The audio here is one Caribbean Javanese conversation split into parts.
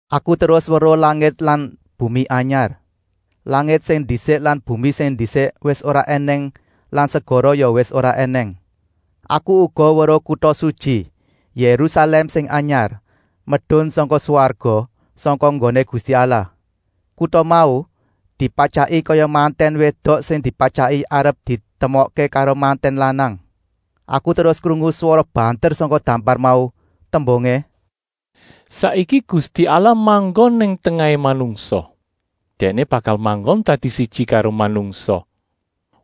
Aku terus weruh langit lan bumi anyar. Langit sing ndisik lan bumi sing ndisik wis ora ènèng lan segara ya wis ora ènèng. Aku uga weruh kuta sutyi, Yérusalèm sing anyar, medun sangka swarga, sangka nggoné Gusti Allah. Kuta mau dipatyaki kaya mantèn wédok sing dipatyaki arep ditemokké karo mantèn lanang. Aku terus krungu swara banter sangka dampar mau, tembungé: “Saiki Gusti Allah manggon nang tengahé manungsa! Dèkné bakal manggon dadi siji karo manungsa.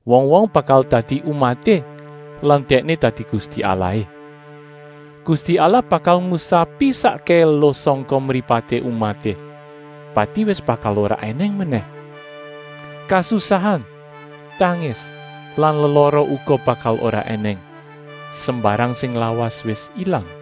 Wong-wong bakal dadi umaté lan Dèkné dadi Gusti Allahé. Gusti Allah bakal ngusapi sakkèhé eluh sangka mripaté umaté. Pati wis bakal ora ènèng menèh. Kasusahan, tangis lan lelara uga bakal ora ènèng. Sembarang sing lawas wis ilang.”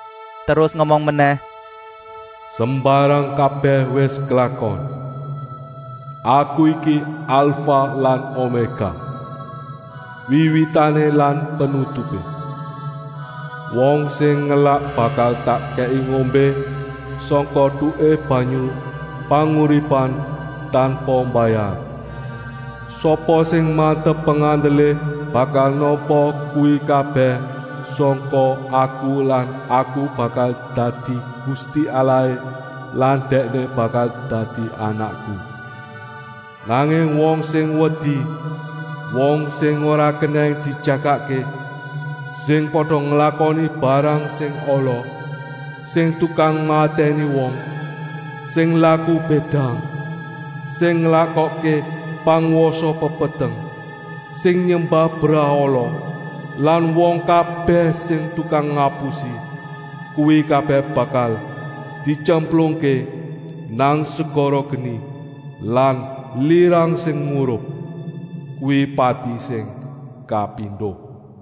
Terus ngomong menèh: “Sembarang kabèh wis klakon. Aku iki Alfah lan Omékah, Wiwitané lan Penutupé. Wong sing ngelak bakal tak kèki ngombé sangka etuké banyu panguripan, tanpa mbayar. Sapa sing mantep pengandelé bakal nampa kuwi kabèh sangka Aku lan Aku bakal dadi Gusti Allahé lan dèkné bakal dadi anakku. Nanging wong sing wedi, wong sing ora kenèng dijagakké, sing pada nglakoni barang sing ala, sing tukang matèni wong, sing laku bédang, sing nglakokké pangwasa pepeteng, sing nyembah brahala lan wong kabèh sing tukang ngapusi, kuwi kabèh bakal dityemplungké nang segara geni lan lirang sing murup. Kuwi pati sing kapindo.”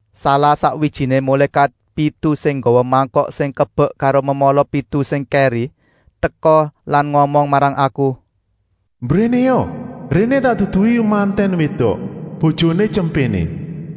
Salah-sakwijiné mulékat pitu sing nggawa mangkok sing kebek karo memala pitu sing kèri, teka lan ngomong marang aku: “Mbrénéa! Réné tak duduhi mantèn wédok, bojoné Tyempéné.”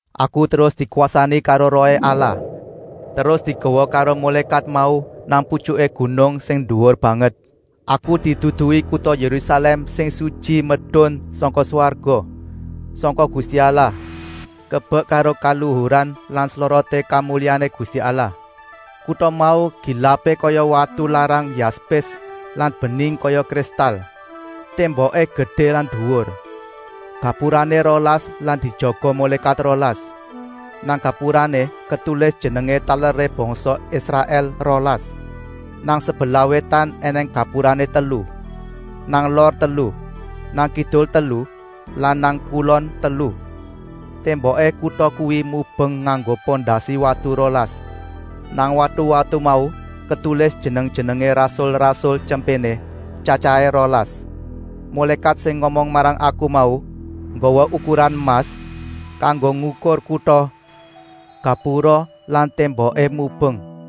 Aku terus dikwasani karo Rohé Allah, terus digawa karo mulékat mau nang putyuké gunung sing duwur banget. Aku diduduhi kuta Yérusalèm sing sutyi medun sangka swarga, sangka Gusti Allah, kebek karo kaluhuran lan sloroté kamulyané Gusti Allah. Kuta mau gilapé kaya watu larang yaspis lan bening kaya kristal. Témboké gedé lan duwur, gapurané rolas lan dijaga mulékat rolas. Nang gapurané ketulis jenengé taleré bangsa Israèl rolas. Nang sebelah wétan ènèng gapurané telu, nang lor telu, nang kidul telu lan nang kulon telu. Témboké kuta kuwi mubeng nganggo pondasi watu rolas. Nang watu-watu mau ketulis jeneng-jenengé rasul-rasul Tyempéné, tyatyahé rolas. Mulékat sing ngomong marang aku mau nggawa ukuran emas, kanggo ngukur kuta, gapura lan témboké mubeng.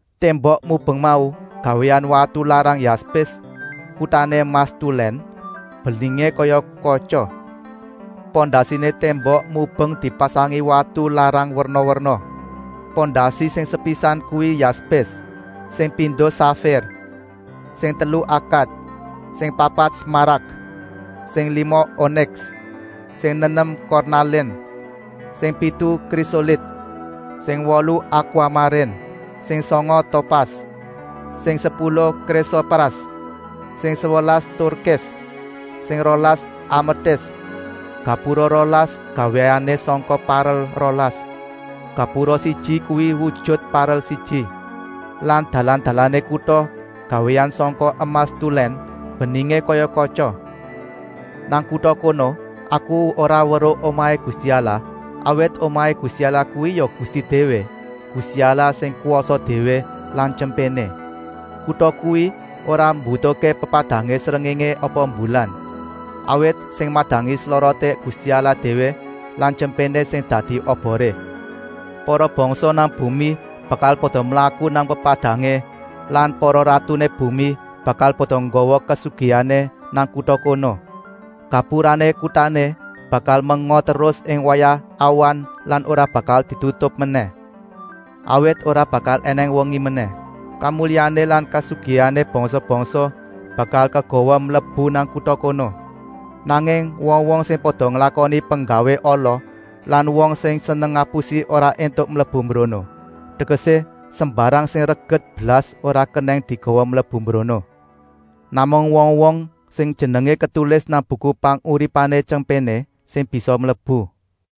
Témbok mubeng mau gawéan watu larang yaspis, kutané emas tulèn, beningé kaya katya. Pondasiné témbok mubeng dipasangi watu larang werna-werna. Pondasi sing sepisan kuwi yaspis, sing pindo safir, sing telu akat, sing papat smarak, sing lima oniks, sing nenem kornalin, sing pitu krisolit, sing wolu akwamarin, sing sanga topas, sing sepuluh krisopras, sing sewelas turkis, sing rolas ametis. Gapura rolas gawéané sangka parel rolas. Gapura siji kuwi wujut parel siji. Lah dalan-dalané kuta gawéan sangka emas tulèn, beningé kaya katya. Nang kuta kono aku ora weruh omahé Gusti Allah, awit omahé Gusti Allah kuwi ya Gusti déwé, Gusti Allah sing kwasa déwé lan Tyempéné. Kuta kuwi ora mbutuhké pepadangé srengéngé apa mbulan, awit sing madangi sloroté Gusti Allah déwé lan Tyempéné sing dadi oboré. Para bangsa nang bumi bakal pada mlaku nang pepadangé lan para ratuné bumi bakal pada nggawa kasugihané nang kuta kono. Gapurané kutané bakal menga terus ing wayah awan lan ora bakal ditutup menèh, awit ora bakal ènèng wengi menèh. Kamulyané lan kasugihané bangsa-bangsa bakal kagawa mlebu nang kuta kono. Nanging wong-wong sing pada nglakoni penggawé ala lan wong sing seneng ngapusi ora éntuk mlebu mbrono, tegesé sembarang sing reget blas ora kenèng digawa mlebu mbrono. Namung wong-wong sing jenengé ketulis nang Buku Panguripané Tyempéné sing bisa mlebu.